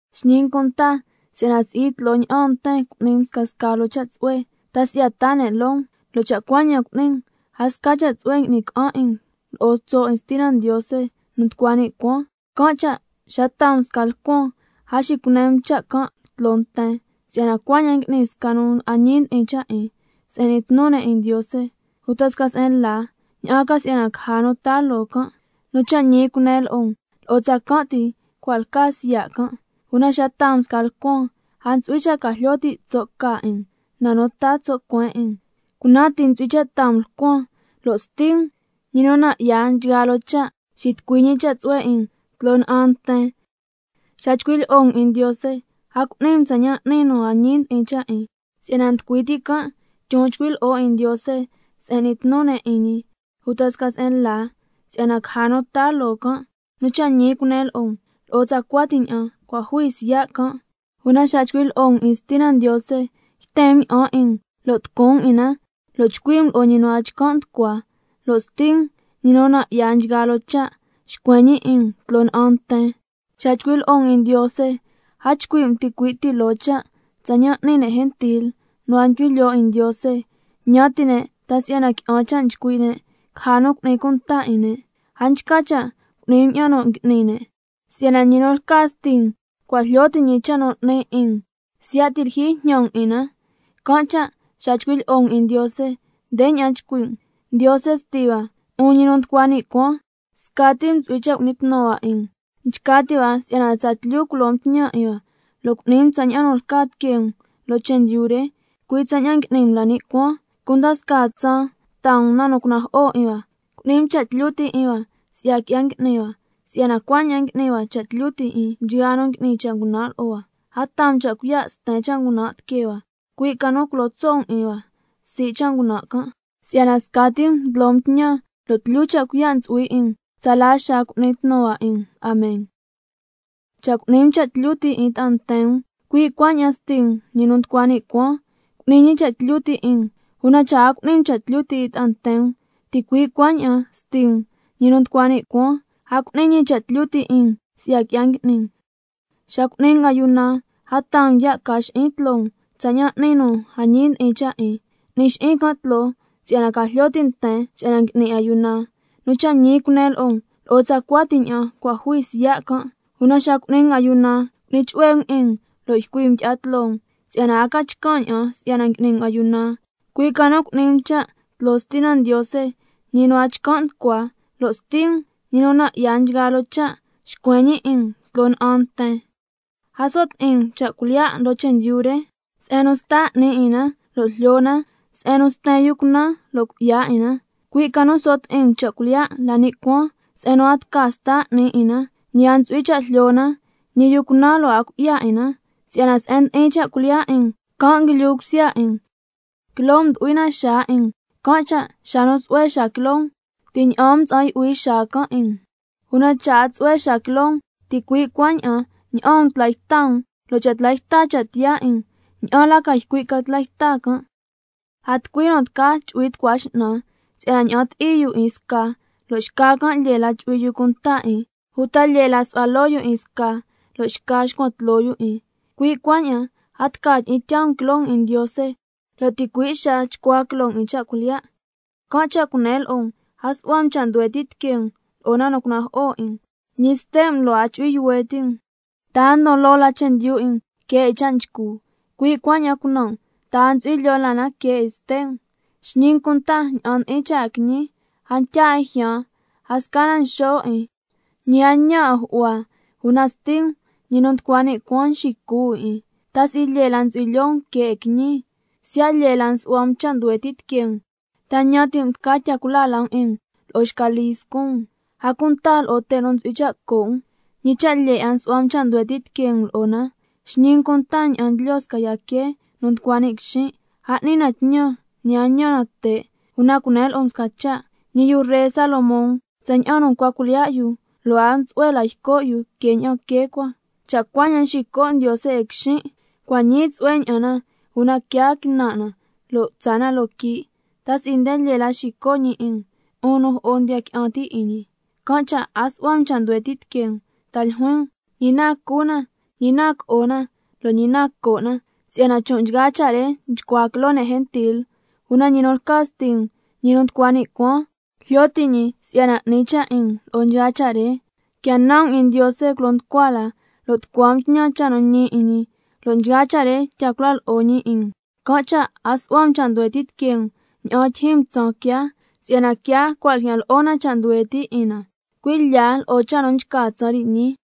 Xñi um cunta si'yana si'i tloo ña'an nten cu'ni um scasca loo cha' tsu'hue, ta si'yana taa ne' loo um, lo' cha' cuaña'an cu'ni um, a sca cha' tsu'hue qui'ni ca'an 'in um lo'o tso' 'in Stina Ndiose nu nducua ni' cuaan. Can' cha' xa taa um sca lcuan, a xicune um cha' can' tloo nten, si'yana cuaña'an ngui'ni sca nu a ñi ndi'in cha' 'in se'en n'ni tnu ne' 'in Ndiose, uta sca se'en la, ña'an ca si'yana caja nu taa loo can'. Nu cha' ñi cunen lo'o um, lo'o tsacan' ti cua' lca siya' can'. Una xa taa um sca lcuan, a ntsu'hui cha' ca jlyo ti' tso' ca 'in um na nu taa tso' cuen 'in um, cunan ti ntsu'hui cha' taa um lcuan, lo' Sti um, ñi nu nan' 'ya nchgaa loo cha', xitucui ñi cha' tsu'hue 'in um tloo na'an nten. Xa chcui' lyi'o um 'in Ndiose, a cu'ni um tsaña'an n'ni nu a ñi ndi'in cha' 'in, si'yana nducui ti' can' ndyon nchcui' lyi'o 'in Ndiose se'en n'ni tnu ne' 'in ñi, uta sca se'en la, si'yana caja nu taa loo can'. Nu cha' ñi cunen lo'o um, lo'o tsacua ti ña'an cua' jui siya' can'. Una xa chcui' lyi'o um 'in Stina Ndiose, yten um ña'an 'in um lo' tucun um 'in na, lo' chcui' um lo'o ñi nu a chcan' nducua, lo' Sti um, ñi nu nan' 'ya nchgaa loo cha', xcuen ñi 'in um tloo na'an nten. Xa nchcui' lyi'o um 'in Ndiose, a chcui' um ticui' ti loo cha' tsaña'an n'ni ne' gentil nu a ndyu'hui lyoo 'in Ndiose, ñan ti' ne' ta si'yana qui'an cha' chcui' ne', caja nu cu'ni cunta 'in ne'. A nchca cha' cu'ni um ña'an nu ngui'ni ne', si'yana ñi nu lca Sti um cua' jlyo ti' ñi cha' nu 'ni 'in um, siya' ti' lyijyi jñan um 'in na. Can' cha' xa chcui' lyi'o um 'in Ndiose, ndeña'an chcui' um: Ndiose Sti hua, 'un ñi nu nducua ni' cuaan, scati um ntsu'hui cha' cu'ni tnu hua 'in um. Nchca ti' hua si'yana tsatlyu culo um tñan 'in hua, lo' cu'ni um tsaña'an nu lca tiquee um loo chendyu re, cui' tsaña'an ngui'ni um la ni' cuaan. Cunda scaa tsaan taa um na nu cunajo'o 'in hua. Cu'ni um cha' tlyu ti' 'in hua si'ya qui'ya ngui'ni hua, si'yana cuaña'an ngui'ni hua cha' tlyu ti' 'in nchgaa nu ngui'ni cha' ngunan' lo'o hua. A taa um cha' cuiya' sten cha' ngunan' tiquee hua, cui' ca nu culo tso' um 'in hua sii' cha' ngunan' can', si'yana scati um ndlo um tñan, lo' tlyu cha' cuiya' ntsu'hui 'in um, tsala xaa cu'ni tnu hua 'in um. Amen. Cha' cu'ni um cha' tlyu ti' 'in ta'a nten um, cui' cuaña'an Sti um, ñi nu nducua ni' cuaan, cu'ni ñi cha' tlyu ti' 'in um, una cha' a cu'ni um cha' tlyu ti' 'in ta'a nten um, ticui' cuaña'an Sti um, ñi nu nducua ni' cuaan, a cu'ni ñi cha' tlyu ti' 'in um si'ya qui'ya ngui'ni um. Xa cu'ni um ayuna, a taa um ya' ca xi'in tloo um tsaña'an n'ni nu a ñi ndi'in cha' 'in, n'ni xi'in can' tloo si'yana ca jlyo ti' nten si'yana ngui'ni ayuna. Nu cha' ñi cunen lo'o um, lo'o tsacua ti ña'an cua' jui siya' can'. Una xa cu'ni um ayuna, cu'ni chu'hue um 'in um, lo' ycui um tyi'a tloo um, si'yana a ca chcan' ña'an si'yana ngui'ni um ayuna, cui' ca nu cu'ni um cha' can' tloo Stina Ndiose, ñi nu a chcan' nducua, lo' Sti um, ñi nu nan' 'ya nchgaa loo cha', xcuen ñi 'in um tloo na'an nten. A so' ti'in um cha' cuilyiya' loo chendyu re, se'en nu sta 'ni 'in na lo' jlyo na, se'en nu sten yu cunan lo' cui'ya 'in na, cui' ca nu so' ti'in um cha' cuilyiya' la ni' cuaan, se'en nu a tca sta 'ni 'in na, ñi a ntsu'hui cha' jlyo na, ñi yu cunan lo' a cui'ya 'in na. Si'yana se'en ndi'in cha' cuilyiya' 'in um, can' nguilyu cusya 'in um. Quiloo um ndu'hui na xaa 'in um, can' cha' xa nu tsu'hue xaa quiloo um, ti' ña'aan um mtsa'an yu'hui xaa can' 'in um, una cha' a tsu'hue xaa quiloo um, ticui' cuaña'an ña'aan um tla yta um. Lo' cha' tla yta cha' tiyaa 'in um, ¿ña'an la ca ycui' ca tla yta can'? A tucui nu tca chu'hui tucua x'nan, si'yana ña'an ti'i yu 'in sca, lo' xca can' lyee la chu'hui yu cunta 'in, uta lyee la su'hua loo yu 'in sca, lo' xca xcuan tloo yu 'in. Cui' cuaña'an a tca tyi'in tyaa um quiloo um 'in Ndiose, lo' ticui' xaa chcua quiloo um 'in cha' cuilyiya'. Can' cha' cunen lo'o um: A su'hua um cha' nduhue ti' tiquee um lo'o na nu cunajo'o 'in um, ñi ste' um lo' a chu'hui yuhue' ti' um. ¿Ta a ndon loo la chendyu 'in um que 'in cha' nchcu, cui' cuaña'an cunan' um, ta a ntsu'hui lyoo la na que 'in ste' um? Xñi um cunta ña'an ndi'in cha' 'in quiñi, a ntya 'in jyaan, a sca na nxo' 'in, ñi a ntñan 'in ju'hua, una Sti um, ñi nu nducua ni' cuaan nxicu 'in 'in. ¿Ta si'i lyee la ntsu'hui lyoo um que 'in quiñi? Siya' lyee la nsu'hua um cha' nduhue ti' tiquee um, ¿ta ñan ti' um tca tya cula la um 'in um lo'o xca lii scun um? A cunta lo'o te' nu ntsu'hui cha' co' um, ¿ñi cha' lyee 'a nsu'hua um cha' nduhue ti' tiquee um lo'o na? Xñi um cunta ña'an ndlyo sca yca quee nu nducua ni' quixin', a n'ni na tñan, ñi a ntñan na te', una cunen lo'o um sca cha', ñi yu ree Salomón tsaña'an nu ncua cuilyiya' yu, lo' a tsu'hue la yco' yu que ña'an quee cua. Cha' cuaña'an nxico' Ndiose 'in quixin', cua' ñii tsu'hue ña'an na una quiaa quinan' na lo' tsaa na loo quii'. ¿Ta si'i nde lyee la xico' ñi 'in um, 'un nu jo'o ndiya qui'an ti' 'in ñi? Can' cha' a su'hua um cha' nduhue ti' tiquee um, ta ljuin um: ¿Ñi na cu na, ñi na co'o na, lo' ñi na co' na? Si'yana chon' nchgaa cha' re nchcua quiloo ne' gentil, una ñi nu lca Sti um, ñi nu nducua ni' cuaan, jlyo ti' ñi si'yana 'ni cha' 'in um lo'o nchgaa cha' re. Quia nan um 'in Ndiose culo nducua la, lo' tucua um tñan cha' nu ñi 'in ñi, lo' nchgaa cha' re tya cula lo'o ñi 'in um. Can' cha' a su'hua um cha' nduhue ti' tiquee um ña'an tyijyin um tsaan quiaa, si'yana quiaa cua' ljyan lo'o na cha' nduhue ti' 'in na, cui' lya lo'o cha' nu nchca tsaan re ñii.